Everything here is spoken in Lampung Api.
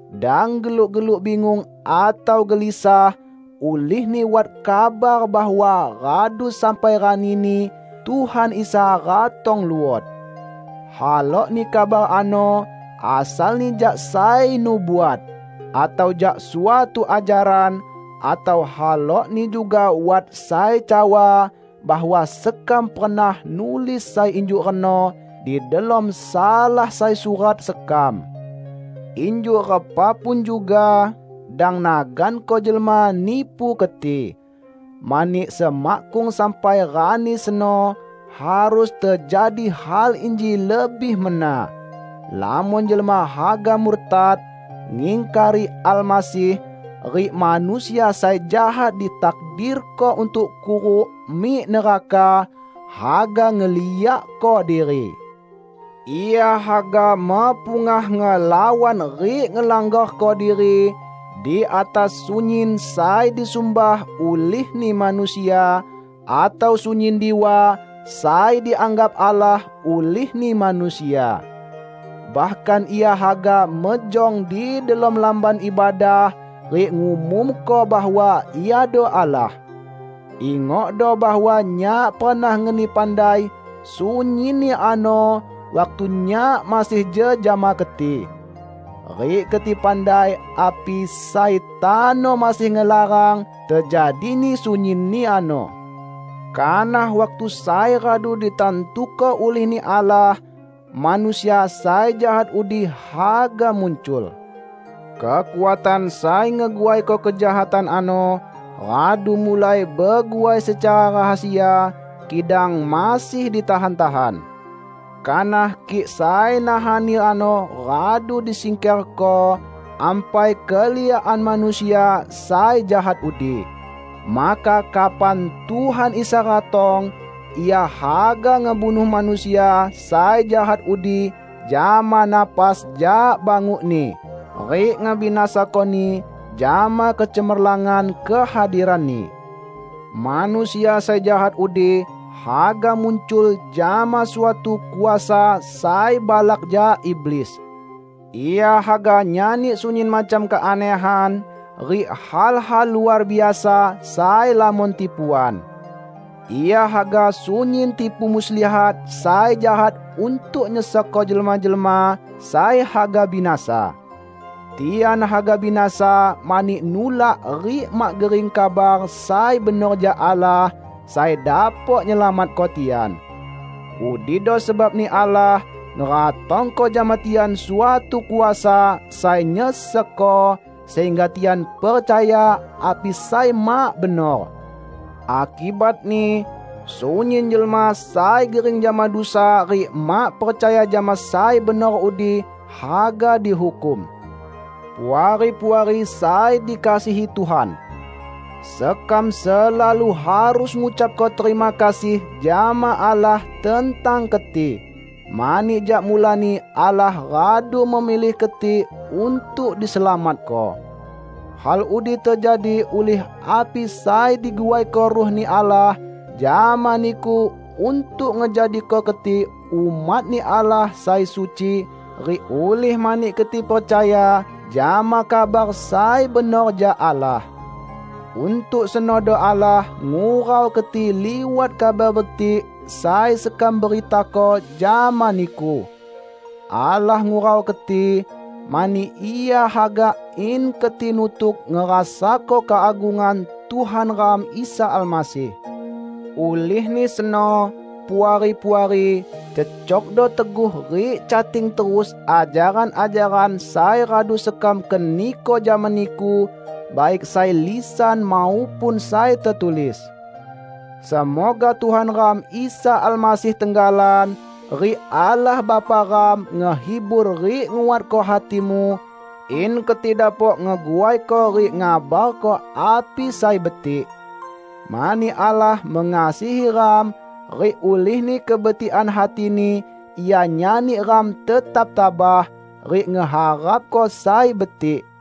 Dang geluk-geluk bingung atau gelisah ulihni wat kabar bahwa radu sampai ranini Tuhan Isa ratong luot. Halokni kabar ano asalni jak sai nubuat, atau jak suatu ajaran; atau halokni juga wat sai cawa bahwa sekam pernah nulis sai injuk reno di delom salah sai surat sekam. Injuk repa pun juga, dang naganko jelma nipu keti. Mani semakkung sampai Rani seno, harus tejadi hal inji lebih mena: Lamon jelma haga murtad, ngingkari Almasih; rik Manusia sai Jahat ditakdirko untuk kuruk mik neraka, haga ngeliakko diri. Ia haga mepungah ngelawan rik ngelanggarko diri di atas sunyin sai disumbah ulihni manusia, atau sunyin diwa sai dianggap Allah ulihni manusia. Bahkan ia haga mejong di delom Lamban Ibadah rik ngumumko bahwa iado Allah. Ingokdo bahwa nyak pernah ngeni pandai sunyinni ano waktu nyak masih jejama keti. Rik keti pandai api sai tano masih ngelarang tejadini sunyinni ano. Kanah waktu sai radu ditantuko ulih-Ni Allah, Manusia sai Jahat udi haga muncul. Kekuatan sai ngeguaiko kejahatan ano radu mulai beguai secara rahasia kidang masih ditahan-tahan. Kanah kik sai nahanni ano radu disingkerko, ampai keliakan Manusia sai Jahat udi. Maka kapan Tuhan Isa ratong, Ia haga ngebunuh Manusia sai Jahat udi jama napas jak banguk-Ni, rik ngebinasakoni jama kecemerlangan kehadiran-Ni. Manusia sai Jahat udi haga muncul jama suatu kuasa sai balak jak iblis. Ia haga nyani sunyin macam keanehan rik hal-hal luar biasa sai lamon tipuan. Ia haga sunyin tipu muslihat sai jahat untuk nyesekko jelma-jelma sai haga binasa. Tian haga binasa mani nulak rik mak gering kabar sai benor jak Allah sai dapok nyelamatko tian. Udido sebabni Allah ngeratongko jama tian suatu kuasa sai nyesekko, sehingga tian percaya api sai mak benor. Akibatni, sunyin jelma sai gering jama dusa rik mak percaya jama sai benor udi, haga dihukum. Puari-puari sai dikasihi Tuhan! Sekam selalu harus ngucapko terima kasih jama Allah tentang keti, mani jak mulani Allah radu memilih keti untuk diselamatko. Hal udi tejadi ulih api sai diguaiko Ruh-Ni Allah jama niku untuk ngejadiko keti umat-Ni Allah sai suci rik ulih mani keti percaya jama kabar sai benor jak Allah. Untuk senodo Allah ngurau keti liwat Kabar Betik sai sekam beritako jama niku. Allah ngurau keti, mani Ia haga in keti nutuk ngerasako keagungan Tuhan ram Isa Almasih. Ulihni seno, Puari-puari, cecokdo teguh rik cating terus ajaran-ajaran sai radu sekam keniko jama niku, baik sai lisan maupun sai tetulis. Semoga Tuhan ram Isa Almasih tenggalan, rik Allah Bapa ram ngehibur rik nguatko hatimu, in keti dapok ngeguaiko rik ngabarko api sai betik. Mani Allah mengasihi ram, rik ulihni kebetikan hati-Ni Ia nyani ram tetap tabah, rik ngeharapko sai betik.